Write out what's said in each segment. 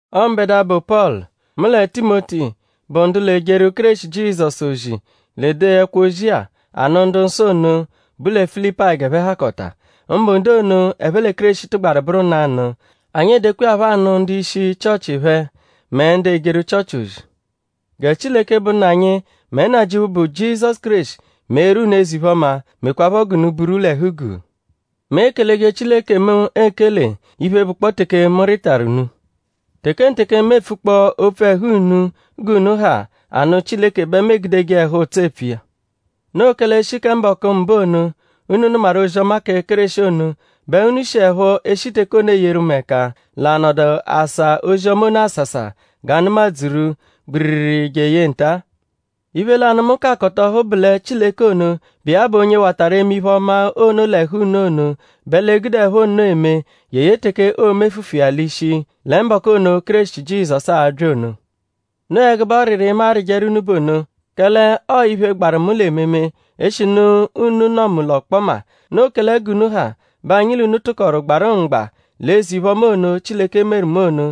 Ọo mbẹdua, bụ Pọlu; mu lẹ Timoti, bụ ndu l'ejeru Kéreshi Jizọsu ozi l'ede ẹkwo-ozi-a anụ ndu-nsọ ono, bu lẹ Filipayi g'ẹphe hakọta; mbụ ndu ono, ẹphe lẹ Kéreshi tụgbaru bụru nanụ. Anyi edekwa iya phọ anụ ndu-ishi Chịochi phẹ mẹ ndu ejeru Chịochi ozi. Gẹ Chileke, bụ Nna anyi; mẹ Nnajịuphu, bụ Jizọsu Kéreshi meeru unu eze-iphe-ọma; mekwaaphọ g'unu buru l'ẹhu-guu. Mu ekeleje Chileke mu ekele iphe, bụkpoo teke mu rịtaru unu. Tekenteke, mu epfukpọo opfu ẹhu unu g'unu ha anụ Chileke bẹ mu egudeje ẹhu-ụtso epfu iya. Noo kẹle e -shi kẹ mbọku mbụ ono, unu nụmaru ozi-ọma kẹ Kéreshi ono bẹ unu shiẹpho e -shi teke ono eyeru mu ẹka l'anọdu asa ozi-ọma ono asasa g'a nụma-dzuru gbiriri jeye nta. Iphe lanụ, mu ka akọta ọhu bụ lẹ Chileke ono, bụ iya bụ onye watarụ eme iphe-ọma ono l'ẹhu unu ono bẹ l'e-gudeẹpho nno eme jeye teke oo-mefufu iya l'ishi lẹ mbọku ono, Kéreshi Jizọsu a-bya ono. Noo ẹgube ọriri, mu arịjeru unu bụ ono; kẹle ọo iphe, gbaru mu l'ememe; eshinu unu nọ mu l'ọkpoma. Noo kẹle g'unu ha bẹ anyi l'unu tụkoru gbarụ mgba l'eze-iphe-ọma ono, Chileke meru mu ono.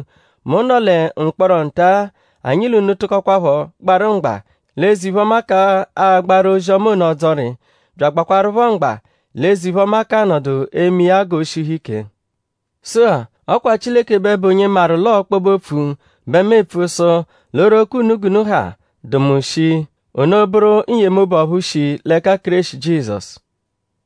Mu nọ lẹ mkpọro nta-a; anyi l'unu tụkokwapho gbarụ mgba l'eze-iphe-ọma k'agbaru ozi-ọma ono ọdzori; bya agbakwarụpho mgba l'eze-iphe-ọma k'anọdu eme iya g'o shihu ike. Sụ-a; ọ kwa Chileke bẹ bụ onye maru l'ọo ọkpobe-opfu bẹ mu epfu sụ l'oghoroko unu g'unu ha dụ mu shii; ono bụru n-yemobu ọphu shi l'ẹka Kéreshi Jizọsu.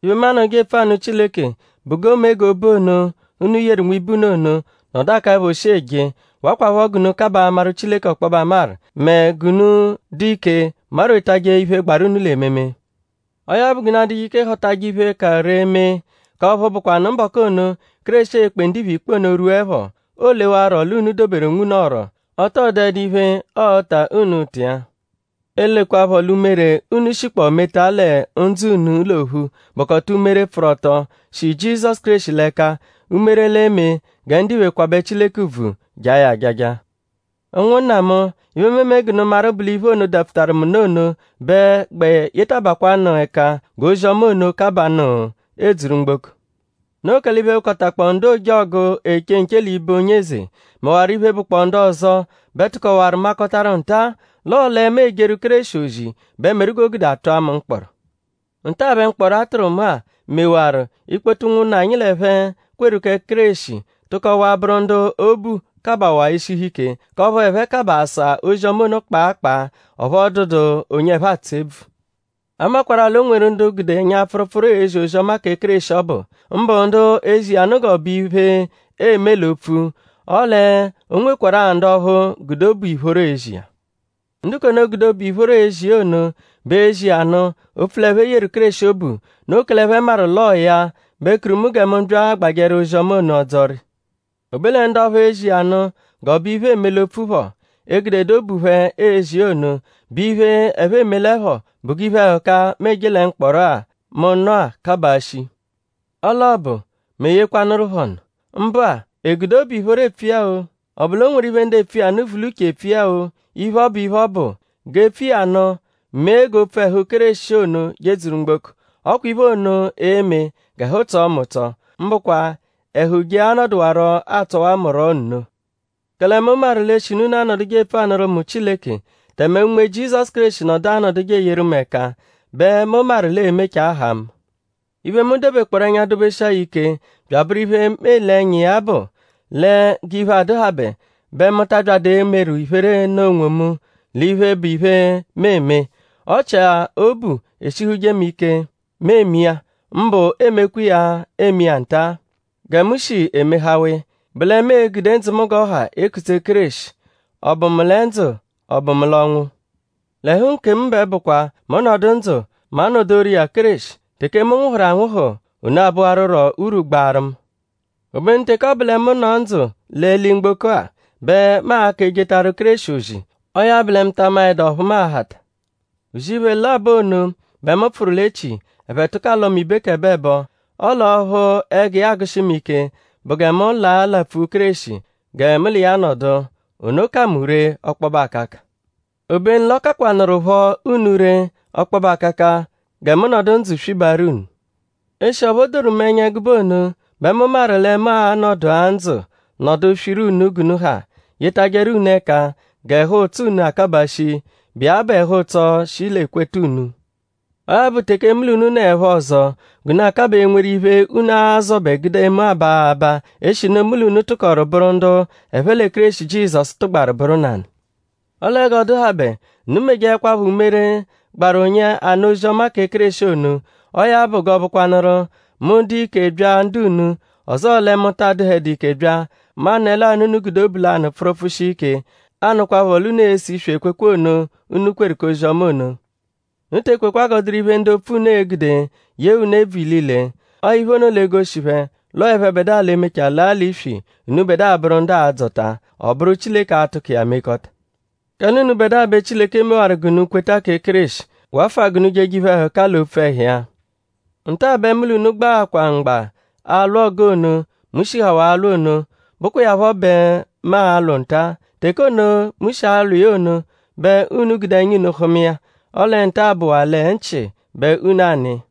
Iphe, mu anọduje epfu anụ Chileke bụ g'o mee g'obu ono, unu yeru nwibe unu ono nọdu akaẹpho shii eje; wakwaphọ g'unu kabaa amaru Chileke ọkpobe amaru; mẹ g'unu dụ ike marwetajẹ iphe, gbaru unu l'ememe. Ọo ya bụ g'unu adụje ike họtaje iphe, ka ree mee; k'ọphu bụkwanu mbọku ono, Kéreshi e-kpe ndiphe ikpe ono rwuẹpho; oolewarọ l'unu doberu onwunu ọ̀rù; ọ tọ dụedu iphe, ọo-ta unu ụta iya; elekwaphọ l'umere, unu shikpọo meta lẹ ndzụ unu l'ophu bụkota umere, pfụru ọto, shi Jizọsu Kéreshi l'ẹka; umere l'e-me gẹ ndiphe kwabẹ Chileke ùbvù; jaa ya ajaja. Ụnwunna mu; iphe, mu eme g'unu maru bụ l'iphe ono, dapfutaru mu nụ ono bẹ gbẹ yetabakwaanụ ẹka g'ozi-ọma ono kabaanụ edzuru mgboko. Noo kẹle iphe, bụkotakpoo ndu ojọgu, eche nche l'ibe onye eze; mẹwaro iphe, bụ ndu ọzo bẹ tụkowaru makọtaru nta-a l'ọo lẹ mu ejeru Kéreshi ozi bẹ meru g'o gude a tụa mu mkpọro. Nta-a bẹ mkpọro-a, a tụru mu-a mekwarụ; ikpoto ụnwunna, anyi l'ẹphe kweru kẹ Kéreshi tụkowaa bụru ndu obu kabawaa eshihu ike; k'ọphu ẹphe kabaa asa ozi-ọma ono kpaakpaa; ọphu ọ dụdu onye ẹphe atsụ ebvu. A makwarụ-a l'o nweru ndu gude ẹnya-pfụrupfuru ezi ozi-ọma kẹ Kéreshi ọbu; mbụ ndu ezi iya nụ g'iphe, eeme l'opfu; ọle o nwekwarụ-a ndu ọphu gude obu ìphóró ezi iya. Ndu k'ono, gude obu ìphóró ezi iya ono bẹ ezi iya nụ; opfu l'ẹphe yeru Kéreshi obu. Noo kẹle ẹphe maru l'ọo ya bẹ kuru mu gẹ mu bya agbajẹru ozi-ọma ono ọdzori. O be lẹ ndu ọphuu ezi iya nụ g'ọ bụ iphe, eme l'opfu phọ; egudedu obu phẹ ezi iya ono; bụ iphe, ẹphe emelẹpho bụ g'iphe-ẹhuka-a, mu eje lẹ mkpọro-a, mu nọ-a kabaa shii. Ọle ọ bụ;?mu eyekwanụru phẹ ọnu? Mbụ-a;?e gude obu ìphóró epfu iya-o;?ọ bụ l'o nweru iphe, ndu epfu iya nụ vu l'uche epfu iya-o; iphe, ọ bụ; iphe, ọ bụ; g'e pfu iya nụ mee g'opfu ẹhu Kéreshi ono jedzuru mgboko. Ọ kwa iphe ono e-me g'ẹhu tsọo mu ụtso. Mbụkwa ẹhu je anọdukwaro atsọwa mu rọ nno. Kẹle mu maru l'eshinu unu anọduje epfu anụru mu Chileke; tẹme Unme Jizọsu Kéreshi nọdu anọduje eyeru mu ẹka bẹ mu maru l'ee-mechaa haa mu. Iphe, mu dobekpọoru ẹnya dobeshia ya ike bya abụru iphe, mu ele ẹnya iya bụ lẹ g'iphe adụhabe bẹ mu ta abyadụ emeru iphere nụ onwomu l'iphe, bụ iphe, mu eme. Ọ chia iphe, obu eshihuje mu ike mu eme iya; mbụ emekwa iya eme iya nta-a gẹ mu shi emehawa iya; bụ lẹ mu e-gude ndzụ mu g'ọ ha ekutse Kéreshi;?ọ bụ mu lẹ ndzụ??ọ bụ mu l'ọnwu? L'ẹhu nkemu bẹ bụkwa; mu -nọdu ndzụ; mu anodoru iya Kéreshi; teke mu nwụhuru anwụhu; ono a-bụwaruro urwu gbaaru mu. Obenu teke ọ bụ lẹ mu nọ ndzụ l'eli-mgboko-a bẹ mu a-ka ejetaru Kéreshi ozi; ọo ya bụ lẹ mu ta maẹdu ọphu mu a-hata. Uzi iphe labọ ono bẹ mu pfụru l'echi. Ẹphe tụko alọ mu ibekẹboebo. Ọle ọphu ẹgu iya agụshi mu ike bụ gẹ mu laa lapfu Kéreshi gẹ mu l'iya nọdu. Ono ka mu ree ọkpobe akaka. Obenu l'ọ kakwanụrupho unu ree ọkpobe akaka gẹ mu nọdu ndzụ swibaaru unu. Eshi ọphu o doru mu ẹnya ẹgube ono bẹ mu maru lẹ mu a-nọdu-a ndzụ nọdu swiru unu g'unu ha; yetajẹru unu ẹka g'ẹhu-ụtso unu akabaa shi, bụ iya bụ ẹhu-ụtso, shi l'ekweta unu. Ọo ya bụ; teke mu l'unu nọepho ọzo g'unu a-kabaa enweru iphe unu a-zọbe gude mu aba abaa; eshinu mu l'unu tụkoru bụru ndu ẹphe lẹ Kéreshi Jizọsu tụgbaru bụru nanụ. Ọle g'ọ dụhabe; unu mejeẹkwapho umere, gbaru onye anụ ozi-ọma kẹ Kéreshi ono; ọo ya bụ g'ọo-bụkwanuru: mu -dụ ike bya ndu unu; ọzoo lẹ mu ta adụhedu ike bya; mu anụle-a l'unu gude obu lanụ pfụru pfụshia ike; anụkwapho l'unu ese iswi ekwekwe ono, unu kweru k'ozi-ọma ono. Unu te ekwekwa g'ọ dụru iphe, ndu opfu unu e-gude yee unu ebvu ilile. Ọo iphe ono l'e-goshi phẹ l'ọo ẹphebedua l'emechaa laa l'iswi; unubẹdua a-bụru ndu aa-dzọta. Ọ bụru Chileke a-tụko iya mekọta. Kẹle unubẹdua bẹ Chileke mewaru g'unu kweta kẹ Kéreshi; wafụa g'unu jeje iphe-ẹhuka l'opfu ẹhu iya. Nta-a bẹ mu l'unu gbaakwaa mgba alwụ ọgu ono, mu shihawaa alwụ ono, bụkwa iya phọ bẹ mu alwụ nta-a. Teke ono, mu shi alwụ iya ono bẹ unu gude ẹnya unu hụma iya. Ọle nta-a bụwaa lẹ nchị bẹ unu anụ iya.